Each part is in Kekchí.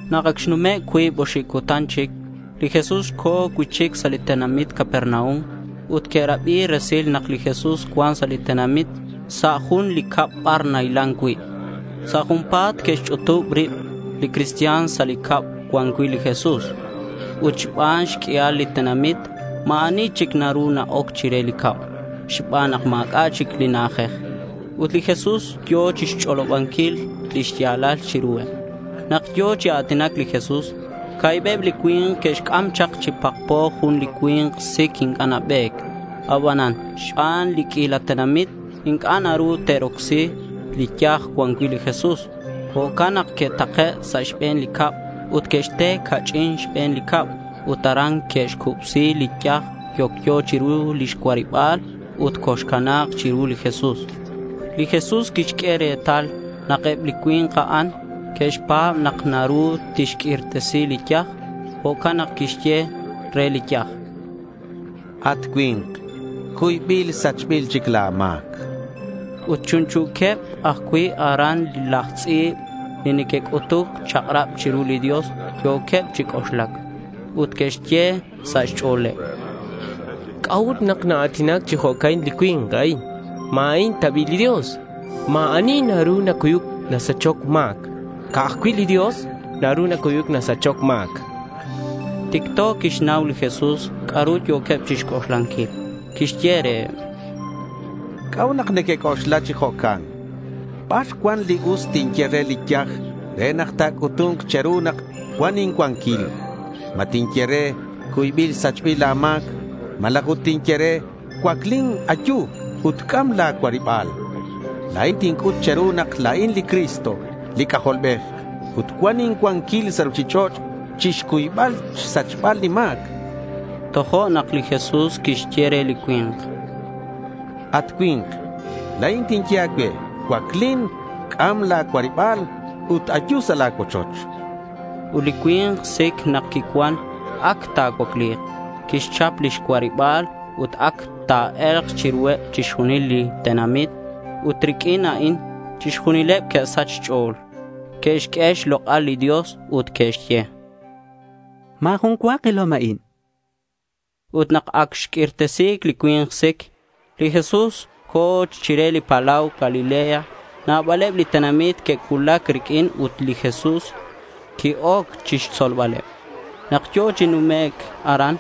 Nak ac xnume' cuib oxib cutan chic, li Jesús co̱ cui'chic sa' li tenamit Capernaum. Ut que'rabi resil nak li Jesús cuan sa' li tenamit sa' jun li cab bar nahilan cui'. Sa' junpa̱t que'xch'utub rib li cristian sa' li cab cuan cui' li Jesús. Ut xban xq'uial li tenamit, ma̱ ani chic naru na-oc chire li cab xban nak ma̱c'a' chic li na'ajej. Ut li Jesús yo̱ chixch'olobanquil li xya̱lal chiruheb. Nak yo̱ chi a̱tinac li Jesús, ca̱hibeb li cui̱nk que'xc'am chak chi pakpo jun li cui̱nk sic. Inc'a' nabe̱c. Abanan xban li q'uila tenamit, inc'a' naru te'rocsi li yaj cuan cui' li Jesús. Jo'can nak que'take' sa' xbe̱n li cab ut que'xte ca'ch'in xbe̱n li cab ut aran que'xcubsi li yaj yocyo chiru lix cuariba̱l ut coxcana̱c chiru li Jesús. Li Jesús quixq'ue retal nak eb li cui̱nk a'an que'xpa̱b nak naru tixq'uirtesi li yaj. Jo'can nak quixye re li yaj: —At cui̱nk, cuybil sachbil chic la̱ ma̱c, chan. Ut chunchu̱queb ajcui' aran laj tz'i̱b li neque'c'utuc xchak'rab li Dios. Yo̱queb chi c'oxlac. Ut que'xye sa' xch'o̱leb: —¿C'a'ut nak naa̱tinac chi jo'can li cui̱nk a'in? ¿Ma a'in ta bi' li Dios? Ma̱ ani naru nacuyuc nasachoc ma̱c. Ca'aj cui' li Dios naru nacuyuc nasachoc ma̱c, chanqueb. Ticto quixnau li Jesús c'a'ru yo̱queb chixc'oxlanquil. Quixye reheb: —¿C'a'ut nak nequec'oxla chi jo'can? ¿Bar cuan li us tinye re li yaj re nak ta̱c'utu̱nk che̱ru nak cuan incuanquil? ¿Ma tinye re, “Cuybil sachbil la̱ ma̱c”, malaj ut tinye re, “Cuaclin, ayu, ut c'am la̱ cuariba̱l”? La̱in tinc'ut che̱ru nak la̱in li Cristo li C'ajolbej, ut cuan incuanquil sa' ruchich'och' chixcuybal xsachbal li ma̱c, chan reheb. Tojo'nak li Jesús quixye re li cui̱nk: —At cui̱nk, la̱in tinye a̱cue, cuaclin, c'am la̱ cuariba̱l ut ayu sa' la̱ cuochoch, chan. Ut li cui̱nk sic nak quicuan ac ta̱cuacli̱k. Quixchap lix cuariba̱l ut ac ta̱e̱lk chiruheb chixjunil li tenamit. Ut riq'uin a'in chixjunileb que'sach xch'o̱l. Que'xq'ue xlok'al li Dios ut que'xye: —Ma̱ jun cua kilom a'in, chanqueb. Ut nak ac xq'uirtesi li cui̱nk sic, li Jesús co̱ chire li palau Galilea. Nabaleb li tenamit que'cuulac riq'uin ut li Jesús qui-oc chixtzolbaleb. Nak yo̱ chi numec' aran,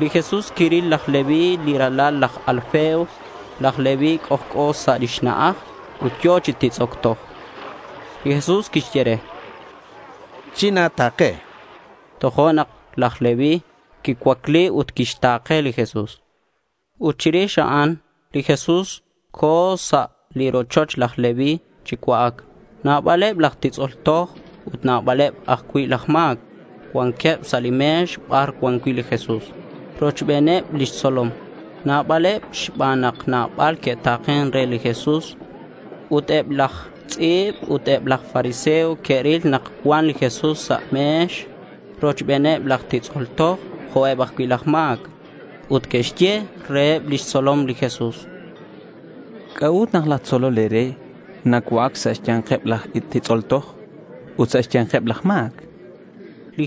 li Jesús quiril laj Leví li ralal laj Alfeo. Laj Leví c'ojc'o sa' xna'aj ut yo̱ chi titz'oc toj. Li Jesús quixye re: —China̱ta̱ke.— Tojo'nak laj Leví quicuacli ut quixta̱ke li Jesús. Ut chirix a'an li Jesús co̱ sa' li rochoch laj Leví chi cua'ac. Nabaleb laj titz'ol toj ut nabaleb ajcui' laj ma̱c cuanqueb sa' li me̱x bar cuan cui' li Jesús rochbeneb lix tzolom. Nabaleb xban nak nabal que'ta̱ken re li Jesús. Ut eb laj tz'i̱b ut eb laj fariseo que'ril nak cuan li Jesús sa' me̱x rochbeneb laj titz'ol toj jo'queb ajcui' laj ma̱c. Ut que'xye reheb lix tzolom li Jesús: —¿C'a'ut nak laj tzolol e̱re nacua'ac sa' xya̱nkeb laj titz'ol toj ut sa' xya̱nkeb laj ma̱c? chanqueb.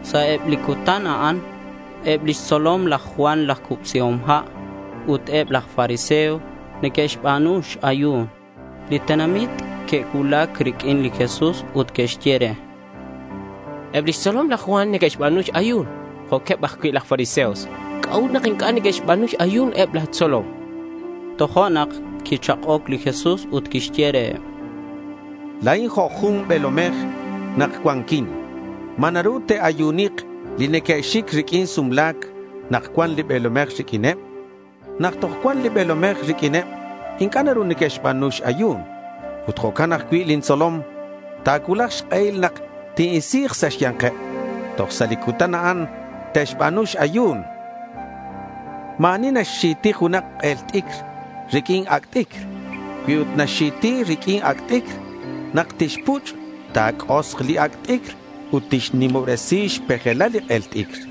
Sa' eb li cutan a'an eb lix tzolom laj Juan laj Cubsihom Ha' ut eb laj fariseo neque'xba̱nu x-ayu̱n. Li tenamit que'cuulac riq'uin li Jesús ut que'xye re: —Eb lix tzolom laj Juan neque'xba̱nu x-ayu̱n jo'queb ajcui' laj fariseo. ¿C'a'ut nak inc'a' neque'xba̱nu x-ayu̱n eb la̱ tzolom? chanqueb re. Tojo'nak quichak'oc li Jesús ut quixye reheb, —La̱in jo' jun be̱lomej nak cuanquin. ¿Ma naru te'ayunik li neque'xic riq'uin sumla̱c nak cuan li be̱lomej riq'uineb? Nak toj cuan li be̱lomej riq'uineb, inc'a' naru neque'xba̱nu x-ayu̱n. Ut jo'can ajcui' lin tzolom. Ta̱cuulak xk'ehil nak tin-isi̱k sa' xya̱nkeb. Toj sa' li cutan a'an te'xba̱nu x-ayu̱n, chan reheb. Ma̱ ani naxxi̱ti junak k'el t'icr riq'uin ac' t'icr. Cui ut naxxi̱ti riq'uin ac' t'icr, nak tixpuch' ta̱c'osk li ac' t'icr ut tixnimobresi xpejelal li k'el t'icr.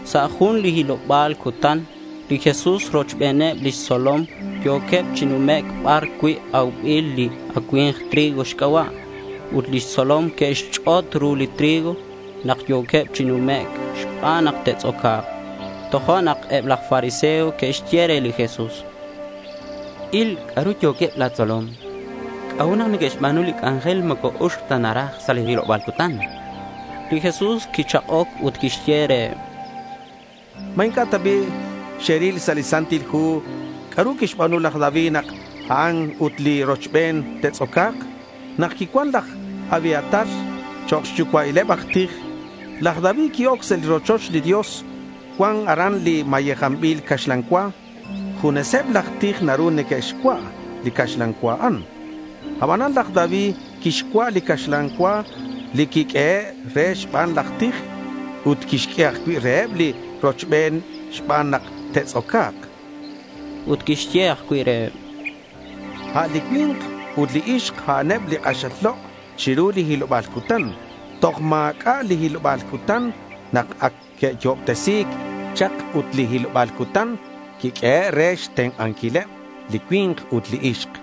Sa' jun li hiloba̱l cutan li Jesús rochbeneb lix tzolom yo̱queb chi numec' bar cui' aubil li acui̱mk trigo xc'aba'. Eb lix tzolom que'xch'ot ru li trigo nak yo̱queb chi numec' xban nak te'tz'oca̱k. Tojo'nak eb laj fariseo que'xye re li Jesús: —Il c'a'ru yo̱queb la̱ tzolom. ¿C'a'ut nak neque'xba̱nu li c'anjel moco uxc ta naraj sa' li hiloba̱l cutan? chanqueb. Li Jesús quichak'oc ut quixye reheb: —¿Ma inc'a' ta bi' xeril sa' li Santil Hu c'a'ru quixba̱nu laj David nak a'an ut li rochben te'tz'oca̱k? Nak quicuan laj Abiatar chok' xyucua'ileb aj tij, laj David qui-oc sa' li rochoch li Dios. Cuan aran li mayejanbil caxlan cua. Juneseb laj tij naru neque'xcua' li caxlan cua a'an. Abanan laj David quixcua' li caxlan cua li quiq'uehe' re xban laj tij ut quixq'ue ajcui' reheb li rochben xban nak te'tz'oca̱k, chan. Ut quixye ajcui' reheb: —A' li cui̱nk ut li ixk a'aneb li k'axal lok' chiru li hiloba̱l cutan. Toj ma̱c'a' li hiloba̱l cutan nak ac que'yo'obtesi̱c chak ut li hiloba̱l cutan quiq'uehe' re xtenk'anquileb li cui̱nk ut li ixk.